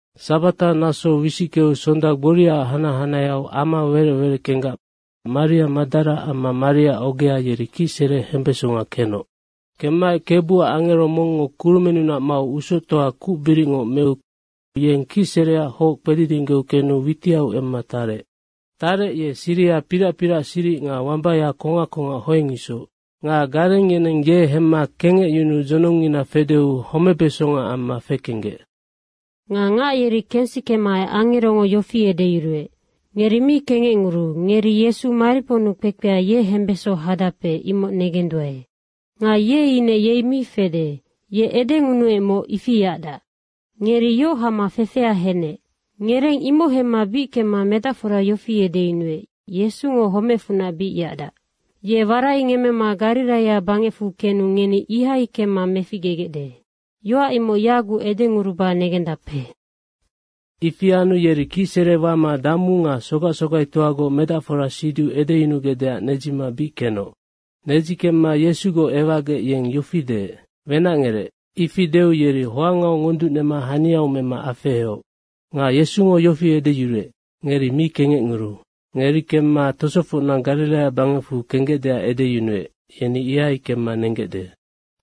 Sabata naso wisickeu sonda gboria hanac hanaheau ama werec wereckenggac Maria Madara amma Maria ogea, yeri kicsere hembesonga kenoc. Kemmaec Kebuac angero mongngo kurumennunac mau usoctoa kucbiricngoc meu yeng kicsereac hoc kpedidinggeu kenu witiau emma tarec. Tarec, ye siriha pirac pirac siric nga wambaya kongac kongac hoeng isoc. Nga gareng yeneng ye hemma kengecyunuu dzonongngina fedeu homebesonga amma fekenggec. Nga ngac yeri kensikemaec angerongo yofi edeyuruec, “Ngeri mi kengecnguruu, ngeri Yesu mariponnu kpekpea, ye hembeso hadape, imoc negenduae. Nga ye ine yei mi fede. Ye edengunuecmoc, ifi yacdac. Ngeri yoc hama fefea henec. Ngereng imoc hemma bic kemma medacfora yofi edeyunuec, ‘Yesungo homecfunac bic yacdac. Ye waraingemmema Gariraia bangecfu kenu ngeni ihai kemma meficgegecde.’ Yoac imoc yagucnoc edenguruba negendape.” Ifi anu yeri kicsere wama damu nga sogac sogaitoagoc medacfora siduc edeyunugecdeac nedzima bic kenoc. Nedzi kemma Yesugoc ewacgec yeng yofi deec, “Wenacngerec.” ifi deu yeri hoangau ngonducnema haniau mema afeheoc. Nga Yesungo yofi edeyuruec, “Ngeri mi kengecnguruu. Ngeri kemma tosofocna Gariraia bangecfu kenggecdeac edeyunuec, yeni ihai kemma nenggecde.”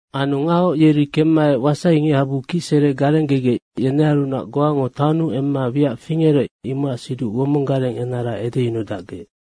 Anu ngahoc yeri kemmaec wasai ngichabu kicsere garenggegec yenearunac goango taonnu emma wiac fingerec, imocac siduc womong gareng enara edeyunudacgec.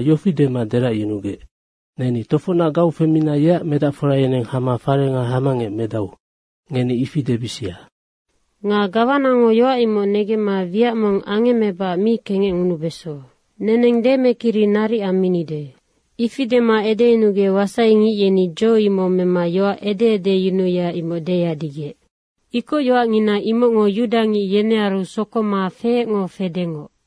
yofi dema deracyunugec, “‘Neni tofocnac gau femina yeac medacfora yeneng hama farenga hamangec medau.’ ngeni ifi debisia. Nga gawanango yoac imoc negemma wiac mong angemmebacac mi kengecngunubeso. Neneng demekiri naric amminide.” Ifi dema edeyunugec wasaingic yeni dzo imoc mema yoac ede edeyunuya, imoc deyadigec. Ikocyoacngina imocngo yudangic yenearu sokoma feecngo fedengoc.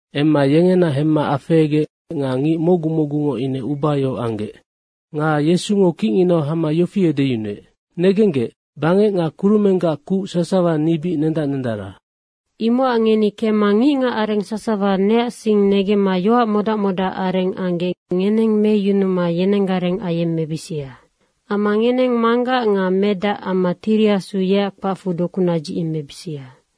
Emma yengena hemma afehegec nga ngic mocgu mocgungo ine ubayohoc anggec. Nga Yesungo kicnginau hama yofi edeyunuec, “Negenggec, bangec nga kurumenggac kuc sasawa ni bic nendac nendara. Imocac ngeni kemma ngicngacareng sasawa neac sing negemma yoac modac modacareng anggec ngeneng meyunuma yenenggareng ayemmebisia. Amma ngeneng Manggac nga Medac amma Tiri Asu yeac kpacfu doku nadzicyemmebisia.